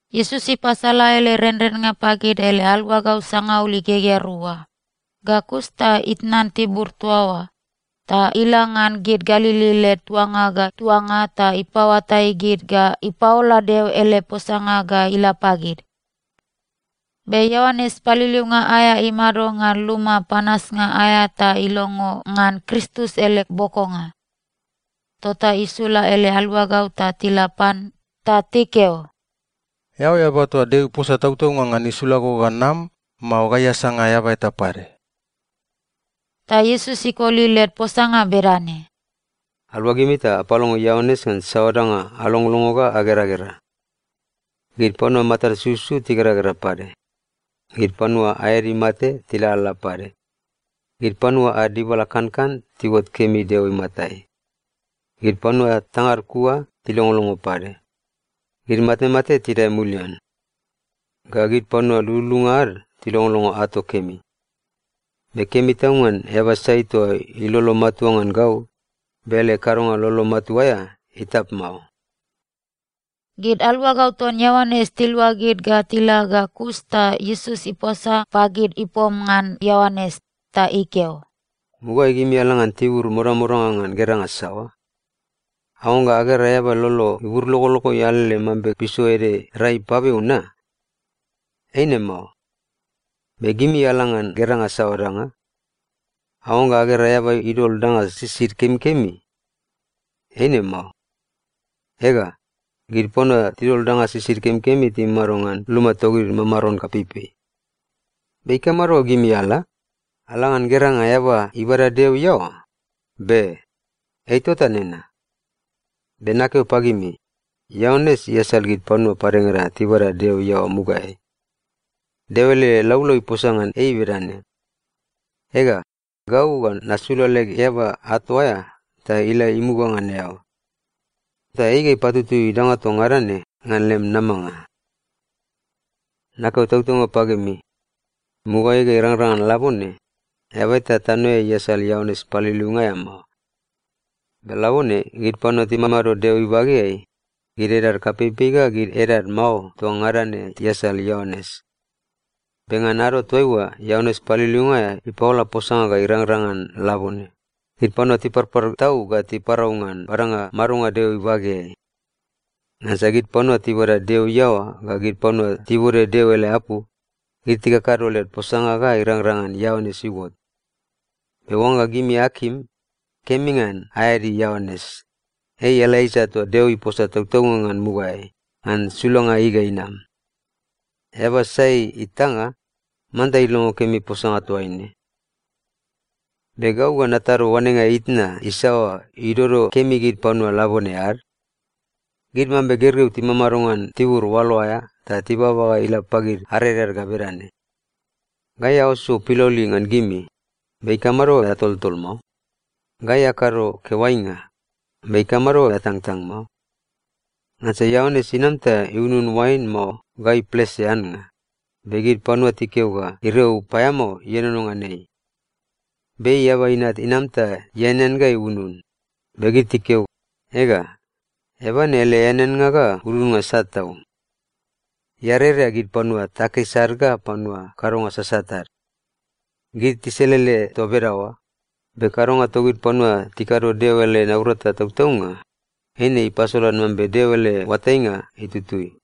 Iesus ipasala ele renrennga pagid ele aluagau sangaul igegea rua, ga kus ta itnan tibur toa oa, ta ila ngan gid Galili led tuanga ga tuanga ta ipapaoatai gid ga ipapaola Deo ele posanga ga ila pagid. Be Ioanes Paliliunga aea imado ngan luma panasnga aea ta ilongo ngan Kristus ele bokonga. Tota isula ele aluagau ta tila pan ta tikeo, “Eao eaba toa Deo iposa tautaunga ngan isula go ga nam, mao gai asanga eaba eta pade?” Ta Iesus ikoli led posanga bedane, “Aluagimi ta apalongo Ioanes ngan saoa danga alongolongo ga ageragera. Gid panua matad sususu tigeragera pade. Gid panua aed imate tilalala pade. Gid panua ad dibala kankan tiuot kemi Deo imatai. Gid panua tangad kua tilongolongo pade. Gid matemate tidae mulian. Ga gid panua lululunga ad tilongolongo ato kemi. Be kemi tau ngan eaba sai toa ilolo matua ngan gau, be ele kadonga lolo matua aea itap mao!” Gid aluagau ton Ioanes tiluagid ga tila ga kus ta Iesus iposa pagid ipom ngan Ioanes. Ta ikeo, “Mugaeai gimi ala ngan tibur modamodanga ngan geranga saoa? Aoangga agera eaba ilolo iburlogologoi alele mambe piso ede rai ipabeu na? Eine mao. Be gimi ala ngan geranga saoa danga? Aoangga agera eaba idol danga sisid kemikemi? Eine mao. Ega, gid panua tidol danga sisid kemikemi timamado ngan luma togid mamaron kapeipei. Be ikamado ga gimi ala? Ala ngan geranga eaba ibada Deo iaoa? Be! Ei tota nena. Be nakeo pagimi, Ioanes iasal gid panua padengada tibabada Deo iaoa mugaeai. Deo ele laulau iposa ngan ei bedane, “‘Ega, gau ga nasula leg eaba ato aea ta ila imuga ngan eao. Ta ei ga ipatutui danga toa ngada ne ngan lem namanga.’ Nakeo tautaunga pagimi, mugaeai ga irangrang ngan labone, eaba eta tanoeai iasal Ioanes Paliliunga aea mao. Be labone gid panua timamado Deo ibageai, gid edad kapeipei ga gid edad mao toa ngada ne tiasal Ioanes. Be ngan ado toaiua Ioanes Paliliunga aea ipaola posanga ga irangrang ngan labone, gid panua tiparpar tau ga tipaparau ngan badanga madonga Deo ibageai. Ngansa gid panua tibada Deo iaoa ga gid panua tibode Deo ele apu, gid tikakado led posanga ga irangrang ngan Ioanes iuot. Be oangga gimi akim, kemi ngan aeadi Ioanes, ei Elaija toa Deo iposa tautaunga ngan mugaeai, ngan sulanga ei ga inam. Eaba sai itanga, manta ilongo kemi posanga toaine. “Be gau ga natado oanenga itna isaoa idodo kemi gid panua labone ad? Gid mambe gergeu timamado ngan tibur oalo aea ta tibaba ga ila pagid areread ga bedane, “‘Gai auso piloli ngan gimi, be ikamado ga atoltol mao? Gai akado keoainga, be ikamado ga atangtang mao?’ Ngansa Ioanes inam ta iunun oain mao ga iplese annga, be gid panua tikeo ga iriau paeamao ienono ngan ei. Be Eaba Inat inam ta ianean ga iunun, be gid tikeo, ‘Ega, eaba ne ele eaneannga ga ununnga sat tau. Ei iarerea gid panua takis ad ga panua kadonga sasat ad.’ Gid tiselele toa bedaoa, be kadonga togid panua tikado Deo ele naurata tautaunga, eine ipasolan mambe Deo ele oatainga itutui.”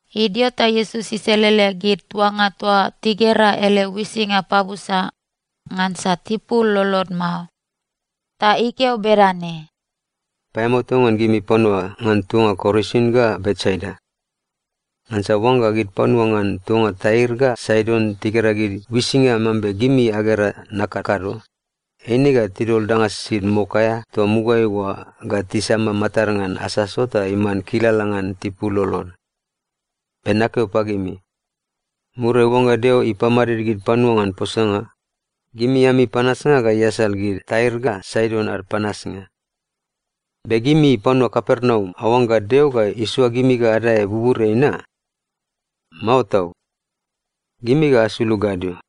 Idio ta Iesus iselele gid tuanga toa tigera ele uisinga pabusa, ngansa tipul lolod mao. Ta ikeo bedane, “Paeamao tau ngan gimi panua ngan tuanga Korasin ga Betsaida! Ngansa oangga gid panua ngan tuanga Tair ga Saidon tigera gid uisinga mambe gimi agera nakakado, eine ga tidol danga sisid mok aea toa mugaeai oa ga tisama matad ngan asaso ta iman kilala ngan tipul lolod. Be nakeo pagimi, muriai oangga Deo ipamadid gid panua ngan posanga, gimi ami panasnga ga iasal gid Tair ga Saidon ad panasnga. Be gimi panua Kapernaum aoangga Deo ga isoa gimi ga adae buburiai na? Mao tau! Gimi ga asulug gadio,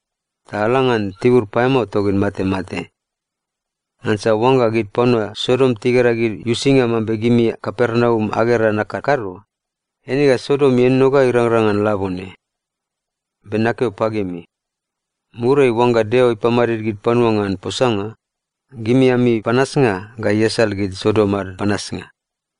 ta ala ngan tibur paeamao togid matemate. Ngansa oangga gid panua Sodom tigera gid uisinga mambe gimi Kapernaum agera nakakado, eine ga Sodom ienono ga irangrang ngan labone. Be nakeo pagimi, muriai oangga Deo ipamadid gid panua ngan posanga, gimi ami panasnga ga iasal gid Sodom ad panasnga.”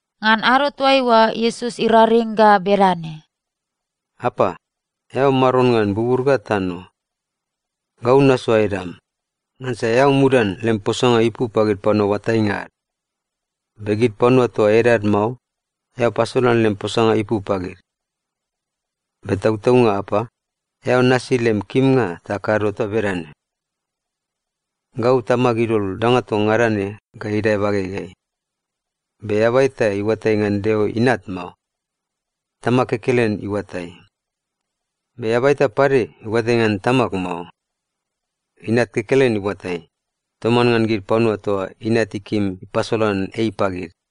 Ngan ado toaiua, Iesus iraring ga bedane, “Apa, eao Maron ngan bubur ga tano. Gau nasoa edam, ngansa eao mudan lem posanga ipu pagid panua oatainga ad. Be gid panua toa edad mao, eao pasolan lem posanga ipu pagid. Be tautaunga Apa, eao nasi lem kimnga ta kado toa bedane. “Gau Tamag idol danga toa ngada ne ga idae bagegeai. Be eaba eta iuatai ngan Deo Inat mao. Tamag kekelen iuatai. Be eaba eta pade iuatai ngan Tamag mao. Inat kekelen iuatai, toman ngan gid panua toa Inat ikim ipasolan ei pagid.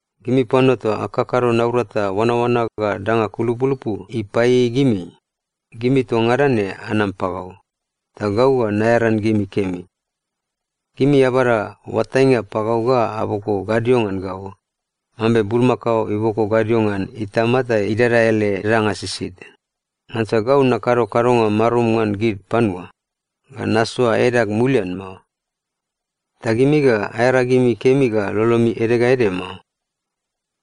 “Gimi panua toa akakado naurata oanaoana ga danga kulupulupu ipaieiei gimi, gimi toa ngada ne anam pagau, ta gau ga naearan gimi kemi. Gimi abada oatainga pagau ga aboko gadio ngan gau, mambe bulmakao iboko gadio ngan itama ta idada ele danga sisid. Ngansa gau nakado kadonga marum ngan gid panua, ga nasoa edag mulian mao. Ta gimi ga aearagimi kemi ga lolomi ede ga ede mao.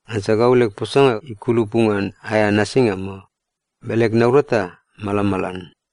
Ngansa gau leg posanga ikulupu ngan aea nasinga mao, be leg naurata malamalan.”